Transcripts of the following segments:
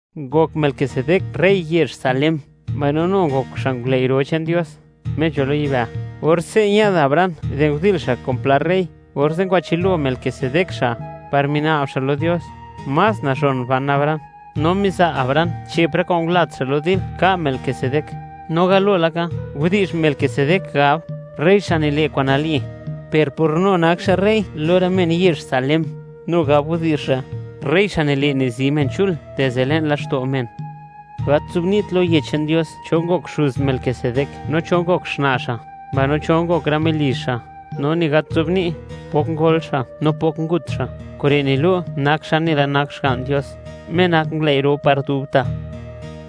Ngok Melquisedec rey yezh Salem, mbaino nu ngok xa' ngulëi' ro che'n Dios, Me nzho lo yibë'. Or ñë'd Abraham di ndil xa' kun pla rë rey, orze' ngwachë'l lo Melquisedec xa', par mina'b xa' lo Dios, más nazhon ban Abraham, no miza' Abraham che'p rë kwa'n ngulat xa' lo dil ka' Melquisedec. No galo laka, widi'zh Melquisedec gab: “Rey, xa' nile' kwa'n nali”, per por nu nak xa' rey lo rë men yezh Salem, nu gab widi'zh re': “Rey, xa' nile' nizi men chul dizde le'n laxto' men.” Gat nzobni't lo Yech che'n Dios cho ngok xuz Melquisedec no cho ngok xna' xa', mbaino cho ngok rë melizh xa'; no ni gat nzobni't pok ngol xa' no pok ngut xa'. Kure' nilu' nak xa' nela nak Xga'n Dios, Me nak ngulëi' ro par dubta'.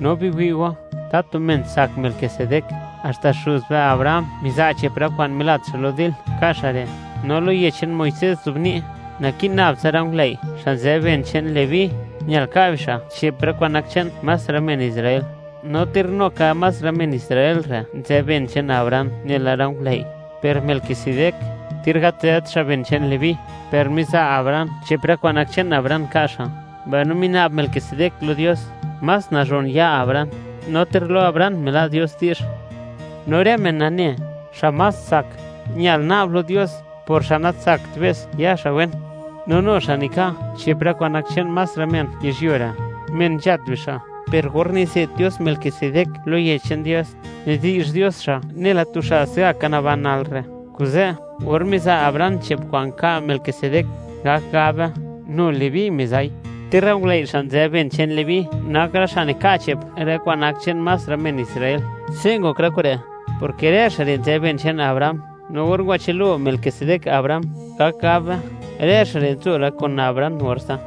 No biwi' go, ¡tatu men tsak Melquisedec! Haxta xuz be Abraham miza' che'p rë kwa'n milat xa' lo dil, ka' xa' re'. No lo yech che'n Muisés nzobni', naki'n nab tsa rë ngulëi', xa' nzë ben che'n Leví, ñal ka' bixa' che'p rë kwa'n nak che'n más rë men Israel, no ter nu ka más rë men Israel re' nzë ben che'n Abraham nela rë ngulëi'. Per Melquisedec, ter gat nzët xa' ben che'n Leví, per miza' Abraham che'p rë kwa'n nak che'n Abraham ka' xa', mbaino mina'b Melquisedec lo Dios, más nazhon ya Abraham, no ter lo Abraham mila' Dios di'zh. No rë men nane, xa' más tsak, ñal na'b lo Dios por xa' natsakt be's, ya xa' wen. No nu xa' nika' che'p rë kwa'n nak che'n más rë men yizhyuo re', men nzhat bixa'; per or nize't Dios Melquisedec lo Yech che'n Dios, nidi'zh Dios xa' nela tu xa' se'gaka naban nal re'. Kuze', or miza' Abraham che'p kwa'n nka' Melquisedec, gak gab be, nu Leví miza'i, ter rë ngulëi' xa' nzë ben che'n Leví nak rë xa' nika' che'p rë kwa'n nak che'n más rë men Israel. Se' ngok rë kure', porke rë xa' re' nzë ben che'n Abraham, no or ngwachël lo Melquisedec Abraham, gak gab be, rë xa' re' nzo la kun Abraham orze'.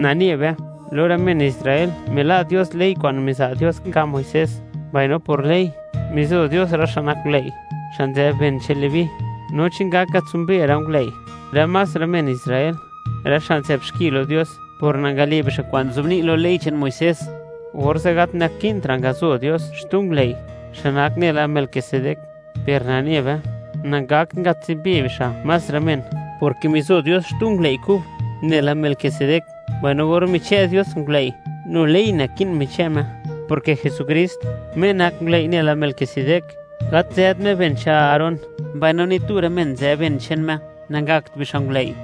Nane be, lo rë men Israel mila' Dios ley kwa'n miza' Dios nka' Muisés; mbaino por ley, mizo Dios rë xa' nak ngulëi', xa' nzë ben che'n Leví. No chi ngak ngatsimbe rë ngulëi' re' más rë men Israel, rë xa' nzë'bxki lo Dios por nangale' bixa' kwa'n nzobni' lo ley che'n Muisés, orze' gat naki'ntra' ngazo Dios xtu ngulëi', xa' nak nela Melquisedec. Per nane be, nangakt nangatsimbe bixa' más rë men, porke mizo Dios xtu ngulëi' kub, nela Melquisedec. Mbaino or michë' Dios ngulëi', nu ley naki'n michë' Me, porke Jesukrist, Me nak ngulëi' nela Melquisedec, gat nzët Me ben che'n Aarón, mbaino ni tu rë men nzë ben che'n Me nangakt bixa' ngulëi',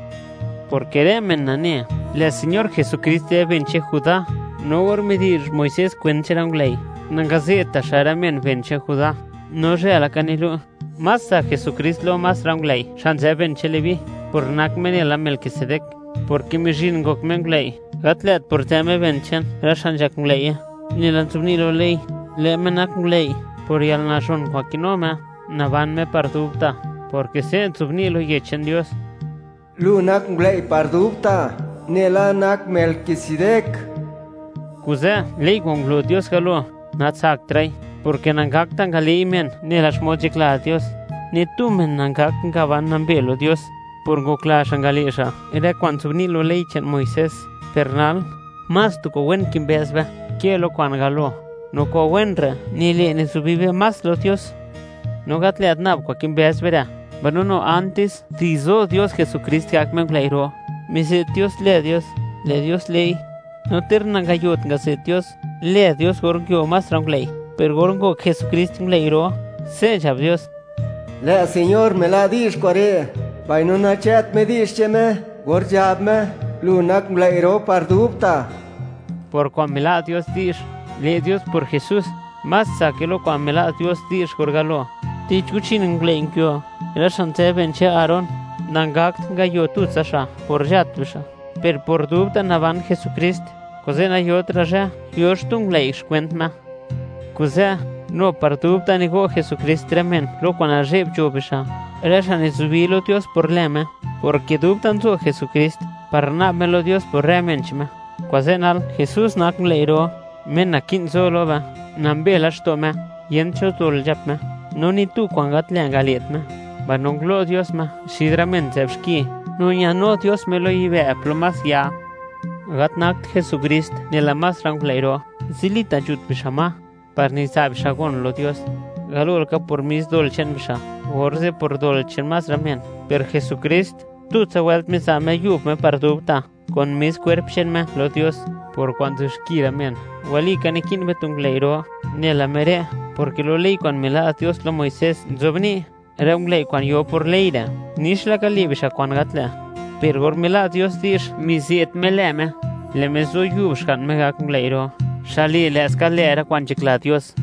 porke rë men nane, lë' Señor Jesukrist nzë ben che'n Judá, no or midi'zh Muisés kwent che'n rë ngulëi', nangaze'tta' xa' rë men ben che'n Judá. No zhë laka nilu', más tsak Jesukrist lo más rë ngulëi' xa' nzë ben che'n Leví, por nak Me nela Melquisedec, porke mizhin ngok Me ngulëi', gat lë't por nzë Me ben che'n rë xa' nzhak ngulëi'ye, nela nzobni' lo ley; lë' Me nak ngulëi' por yalnazhon kwa'n kinu Me, naban Me par dubta', porke se' nzobni' lo Yech che'n Dios: Lu nak ngulëi' par dubta', nela nak Melquisedec. Kuze' ley kwa'n ngulo Dios galo, natsaktra'i, porke nangakta' ngale'i men nela xmod nzhakla Dios. Ni tu men nangakt ngaban nambe lo Dios por ngokla xa' ngale' xa' rë kwa'n nzobni' lo ley che'n Muisés. Per nal, más tu kwa'n wen kimbëz be, ke lo kwa'n galo, no kwa'n wen re' nile' nizubi be más lo Dios. No gat lë't nab kwa'n kimbëz be re', mbaino nu antis de zo Dios Jesukrist gak Me ngulëi' ro, mize't Dios lë Dios, lë' Dios le'i. No ter nangayot ngaze't Dios lë Dios or nguio más rë ngulëi', per or ngok Jesukrist ngulëi' ro, se' nzhab Dios: Lë' Señor mila' di'zh kure', mbaino nachë't Me di'zh che'n Me or nzhab Me: “Lu nak ngulëi' ro par dubta'.” Por kwa'n mila' Dios di'zh, le' Dios por Jesús, más tsake lo kwa'n mila' Dios di'zh or galo. Tich guchin ngulëi' nguio, rë xa' nzë ben che'n Aarón; nangakt ngayo tutsa xa' por nzhat bixa'. Per por dubta' naban Jesukrist, kuze' nayotra' zhë, yo xtu ngulëi' xkwent Me. Kuze', nu par dubta' nigo' Jesukrist rë men lo kwa'n nazhe'b nzho bixa', rë xa' nizubi lo Dios por lë' Me, porke dubta' nzo Jesukrist par na'b Me lo Dios por rë men che'n Me. Kuze' nal Jesús nak ngulëi' ro, Me naki'n zo lo be; nambe laxto' Me, yent cho dol nzhap Me, no ni tu kwa'n gat lë' ngale't Me; mbaino ngulo' Dios Me xid rë men nzë'b xki, no ñanu Dios Me lo yibë' plo más ya. Gat nakt Jesukrist nela más rë ngulëi' ro. Zilita' nzhut bixa' ma par niza' bixa' gon lo Dios, galo laka por mis dol che'n bixa', orze' por dol che'n más rë men. Per Jesukrist, tutsa wëlt miza' Me yub Me par dubta', kun mis kwerp che'n Me, lo Dios, por kwa'n nzë'b xki rë men. Walika naki'n be tu ngulëi' ro nela Me re', porke lo ley kwa'n mila' Dios lo Muisés nzobni', rë ngulëi' kwa'n yo por ley re', nix laka le' bixa' kwa'n gat lë'. Per or mila' Dios di'zh mize't Me lë Dios, lë' Me zo yub Xga'n Me gak ngulëi' ro, xa' le' lë'ska lë', rë kwa'n nzhakla Dios.